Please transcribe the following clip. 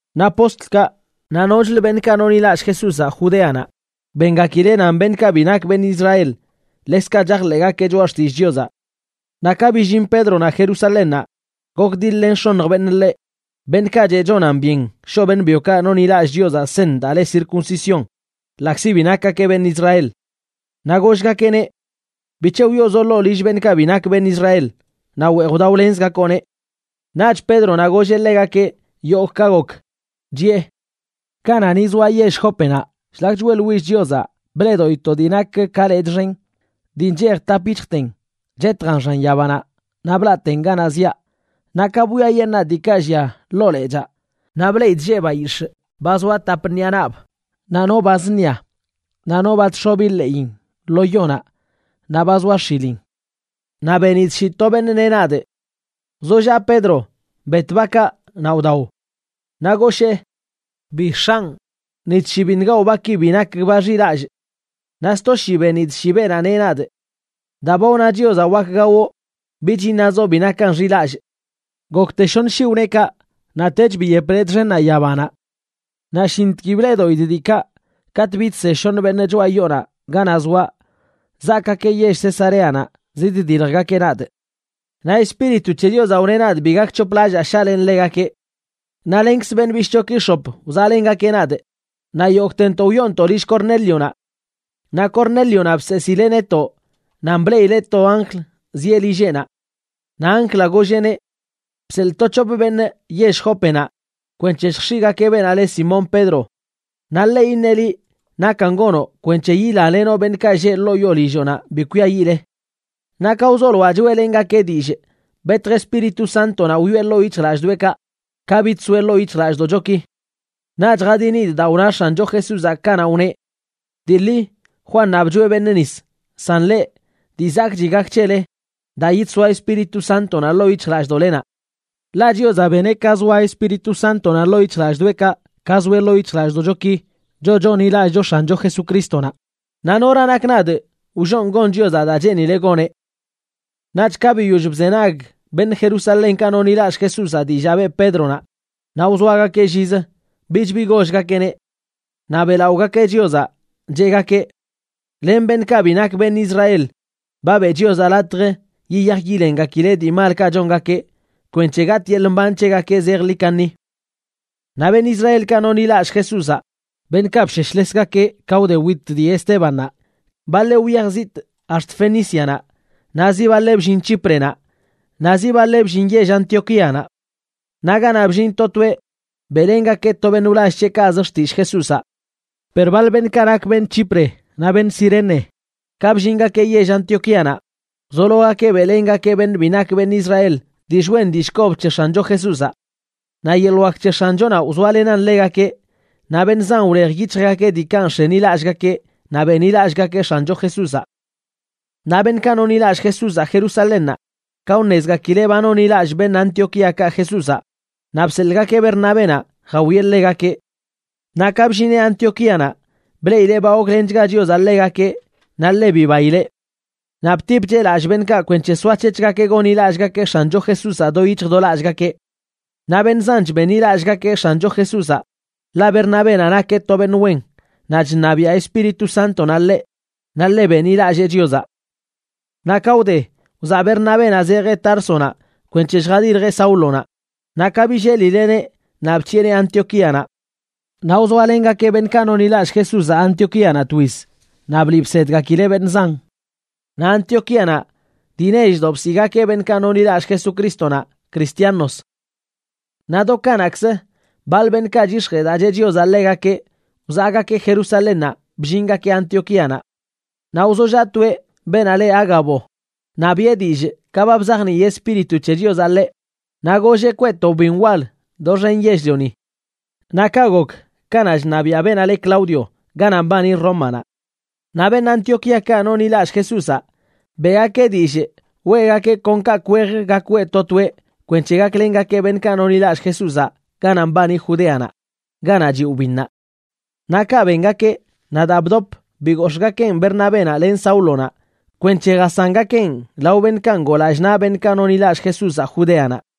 Naꞌ postlkaꞌ naꞌ nochlə beṉꞌkaꞌ nonḻilallꞌ Jesúzaꞌ Judeanaꞌ bengakileꞌ nan beṉꞌkaꞌ bi nak benꞌ Israel ḻekzkaꞌ chajḻeꞌgakeꞌ choꞌa xtillꞌ Chiozaꞌ. Naꞌ ka billin Pédronaꞌ Jerusalénnaꞌ gokdiḻ-len x̱oṉj beṉꞌ ḻeꞌ, beṉꞌkaꞌ cheꞌ chonan byen shoꞌ beṉꞌ byokaꞌ nonḻilallꞌ Chiozaꞌ seṉ daa le circuncisión ḻaꞌkzi bi nakgakeꞌ beṉꞌ Israel. Naꞌ gollgakeꞌneꞌ: ―¿Bic̱he wyoozoꞌ ḻoo yoo lill beṉꞌkaꞌ bi nak beṉꞌ Israel naꞌ weej wdaolenzgakoꞌneꞌ? Naꞌch Pédronaꞌ golleꞌ ḻegakeꞌ yogꞌ ka gok, chiꞌe: ―Kanaꞌ ni zoa yell Jópenaꞌ, shlak choeꞌḻwillꞌ Chiozaꞌ bleꞌdoꞌidꞌ to dii nak ka lechꞌ xen, dii nchej tap yic̱hjten, chetjan xan yabanaꞌ naꞌ blaꞌten ganaꞌ ziaꞌ. Naꞌ ka bwiayeṉaa diikaꞌ llia ḻoo lechaa, naꞌ bleꞌidꞌ lleꞌ bayix̱ꞌ ba zoa tap ṉiꞌa naꞌb, naꞌ no ba zṉia, no ba chx̱obi ḻeꞌin lo yonaꞌ, naꞌ ba zoa x̱ilin. Naꞌ benidꞌ shii to beṉꞌ neꞌ nadꞌ: “Wzollaꞌ Pedro, bet bakaꞌ naꞌ wdao.” Naꞌ goshee: “Bi, X̱anꞌ, ni tshii biṉꞌ gawꞌ baki bi nak ba xilallꞌ.” Naꞌ sto shii benidꞌ shii beenaꞌ neꞌ nadꞌ: “Daa ba wna Chiozaꞌ wak gawoꞌ bich iṉazoꞌ bi nakan xilallꞌ.” Gokte shoṉ shii wne kaꞌ, naꞌtech biyep lechꞌ xennaꞌ yabanaꞌ. Naꞌ shintg bleꞌdoꞌidꞌ diikaꞌ katꞌ bidse shoṉə beṉꞌ choꞌa yoonaꞌ ganaꞌ zoaꞌ, zaakeꞌ yell Cesareanaꞌ ziddiljgakeꞌ nadꞌ. Naꞌ Espíritu c̱he Chiozaꞌ wneꞌ nadꞌ bi gonc̱hoplallaa shaꞌlenꞌ ḻegakeꞌ. Naꞌ lenkz beṉꞌ bishꞌchoki x̱op wzaꞌlengakeꞌ nadꞌ, naꞌ yogꞌtentoꞌ wyoontoꞌ lill Cornélionaꞌ. Naꞌ Cornélionaꞌ bseesileꞌ netoꞌ nan bleꞌileꞌ to anjl zieꞌ lilleꞌnaꞌ. Naꞌ anjlaꞌ golleꞌneꞌ: “Bseḻꞌ to c̱hop beṉꞌ yell Jópenaꞌ kwenc̱he lljx̱iꞌgakeꞌ beenaꞌ le Simón Pedro. Naꞌ ḻeꞌ iṉeꞌ liꞌ nakan gonoꞌ kwenc̱he yilalenoꞌ beṉꞌkaꞌ lleꞌ ḻoo yoo lilloꞌnaꞌ bi kwiayiꞌle.” Naꞌ ka wzoloaꞌ choeꞌlengakee dillꞌ, betj Espíritu Sántonaꞌ wyoꞌe ḻoo yic̱hjlallꞌdoꞌekaꞌ, ka bidsoeꞌ ḻoo yic̱hjlallꞌdoꞌchoki. Naꞌch jadinidꞌ daa wna X̱ancho Jesúzaꞌ kanaꞌ wneꞌ: “Dii ḻi Juannaꞌ bchoeꞌ beṉꞌ nis, san leꞌ, dii zakꞌchi gak c̱hele, daa yidsoa Espíritu Sántonaꞌ ḻoo yic̱hjlallꞌdoꞌlenaꞌ.” Ḻaꞌ Chiozaꞌ beneꞌ ka zoa Espíritu Sántonaꞌ ḻoo yic̱hjlallꞌdoꞌekaꞌ ka zoeꞌ ḻoo yic̱hjlallꞌdoꞌchoki, choꞌ chonḻilallꞌcho X̱ancho Jesucrístonaꞌ. Naꞌ ¿nora nakꞌ nadꞌ wllonꞌ gon Chiozaꞌ daa cheenileꞌ goneꞌ? Naꞌch ka biyoll bzenag beṉꞌ Jerusalénkaꞌ nonḻilallꞌ Jesúzaꞌ dillaa beꞌ Pédronaꞌ, naꞌ wzoagakeꞌ llizə, bich bi gollgakeꞌneꞌ. Naꞌ beꞌlaꞌogakeꞌ Chiozaꞌ, cheꞌgakeꞌ: ―Len beṉꞌkaꞌ bi nak beṉꞌ Israel ba beꞌ Chiozaꞌ latj yiyaj yilengakileꞌ dii malkaꞌ chongakeꞌ kwenc̱he gatꞌ yeḻꞌ mban c̱hegakeꞌ zejḻi kaṉi. Naꞌ beṉꞌ Israelkaꞌ nonḻilallꞌ Jesúzaꞌ, beṉꞌkaꞌ bsheshlesgakeꞌ ka wde wit dii Estébannaꞌ, baḻeꞌ wyaj zitꞌ ax̱t Fenícianaꞌ, naꞌ zi baḻeꞌ bllin Chíprenaꞌ naꞌ zibaḻeꞌ bllin yell Antioquíanaꞌ. Naꞌ ganaꞌ bllin to toeꞌ beꞌlengakeꞌ to beṉꞌ wlall c̱heꞌkaꞌz xtillꞌ Jesúzaꞌ. Per baḻ beṉꞌkaꞌ nak beṉꞌ Chipre naꞌ beṉꞌ Cirene, ka bllingakeꞌ yell Antioquíanaꞌ, wzologakeꞌ beꞌlengakeꞌ beṉꞌ bi nak beṉꞌ Israel dillꞌ wen dillꞌ kob c̱he X̱ancho Jesúzaꞌ. Naꞌ yeḻꞌ wak c̱he X̱anchonaꞌ wzoalenan ḻegakeꞌ, naꞌ beṉꞌ zan wlej yic̱hjgakeꞌ diikaꞌ nx̱enilallꞌgakeꞌ naꞌ benḻilallꞌgakeꞌ X̱ancho Jesúzaꞌ. Naꞌ beṉꞌkaꞌ nonḻilallꞌ Jesúzaꞌ Jerusalénnaꞌ, ka wṉezgakileꞌ ba nonḻilallꞌ beṉꞌ Antioquíakaꞌ Jesúzaꞌ, naꞌ bseḻꞌgakeꞌ Bernabénaꞌ jawieꞌ ḻegakeꞌ. Naꞌ ka bllineꞌ Antioquíanaꞌ, bleꞌileꞌ ba goklenchga Chiozaꞌ ḻegakeꞌ naꞌ ḻe bibaileꞌ. Naꞌ btipcheꞌ lallꞌ beṉꞌkaꞌ kwenc̱he soac̱hec̱hgakeꞌ gonḻilallꞌgakeꞌ X̱ancho Jesúzaꞌ do yic̱hj do lallꞌgakeꞌ. Naꞌ beṉꞌ zanch benḻilallꞌgakeꞌ X̱ancho Jesúzaꞌ, ḻaꞌ Bernabénaꞌ nakeꞌ to beṉꞌ wen, naꞌ chṉabiaꞌ Espíritu Sántonaꞌ ḻeꞌ, naꞌ ḻe benḻilallee Chiozaꞌ. Naꞌ ka wde, wzaꞌ Bernabénaꞌ zejeꞌ Társonaꞌ kwenc̱he lljadiljeꞌ Sáulonaꞌ, naꞌ ka billelileꞌneꞌ naꞌ bc̱hiꞌeneꞌ Antioquíanaꞌ. Naꞌ wzoalengakeꞌ beṉꞌkaꞌ nonḻilallꞌ Jesúzaꞌ Antioquíanaꞌ twiz, naꞌ bliꞌ bsedgakileꞌ beṉꞌ zan. Naꞌ Antioquíanaꞌ dii nechdoꞌ bsiꞌgakeꞌ beṉꞌkaꞌ nonḻilallꞌ Jesucrístonaꞌ “Cristianos”. Naꞌ do kanaꞌkzə, baḻ beṉꞌkaꞌ chyix̱jee daa cheꞌ Chiozaꞌ ḻegakeꞌ wzaꞌgakeꞌ Jerusalénnaꞌ bllingakeꞌ Antioquíanaꞌ. Naꞌ wzollaꞌ toeꞌ, beenaꞌ le Ágabo, naꞌ biꞌe dillꞌ ka ba bzajnii Espíritu c̱he Chiozaꞌ ḻeꞌ, naꞌ golleꞌ kweꞌ to wbin wal doxen yell-lioni. Naꞌ kaꞌ gok kanaꞌ chṉabiaꞌ beenaꞌ le Claudio ganaꞌ mbani Rómanaꞌ. Naꞌ beṉꞌ Antioquíakaꞌ nonḻilallꞌ Jesúzaꞌ beꞌgakeꞌ dillꞌ weꞌgakeꞌ kon kaꞌkꞌ wej gak weꞌ to toeꞌ kwenc̱he gaklengakeꞌ beṉꞌkaꞌ nonḻilallꞌ Jesúzaꞌ ganaꞌ mbani Judeanaꞌ, ganaꞌ chiꞌ wbinnaꞌ. Naꞌ kaꞌ bengakeꞌ, naꞌ daa bdop bigox̱ꞌgakeꞌn Bernabénaꞌ len Sáulonaꞌ kwenc̱he jasangakeꞌn lao beṉꞌkaꞌ ngoo lallꞌ naꞌ beṉꞌkaꞌ nonḻilallꞌ Jesúzaꞌ Judeanaꞌ.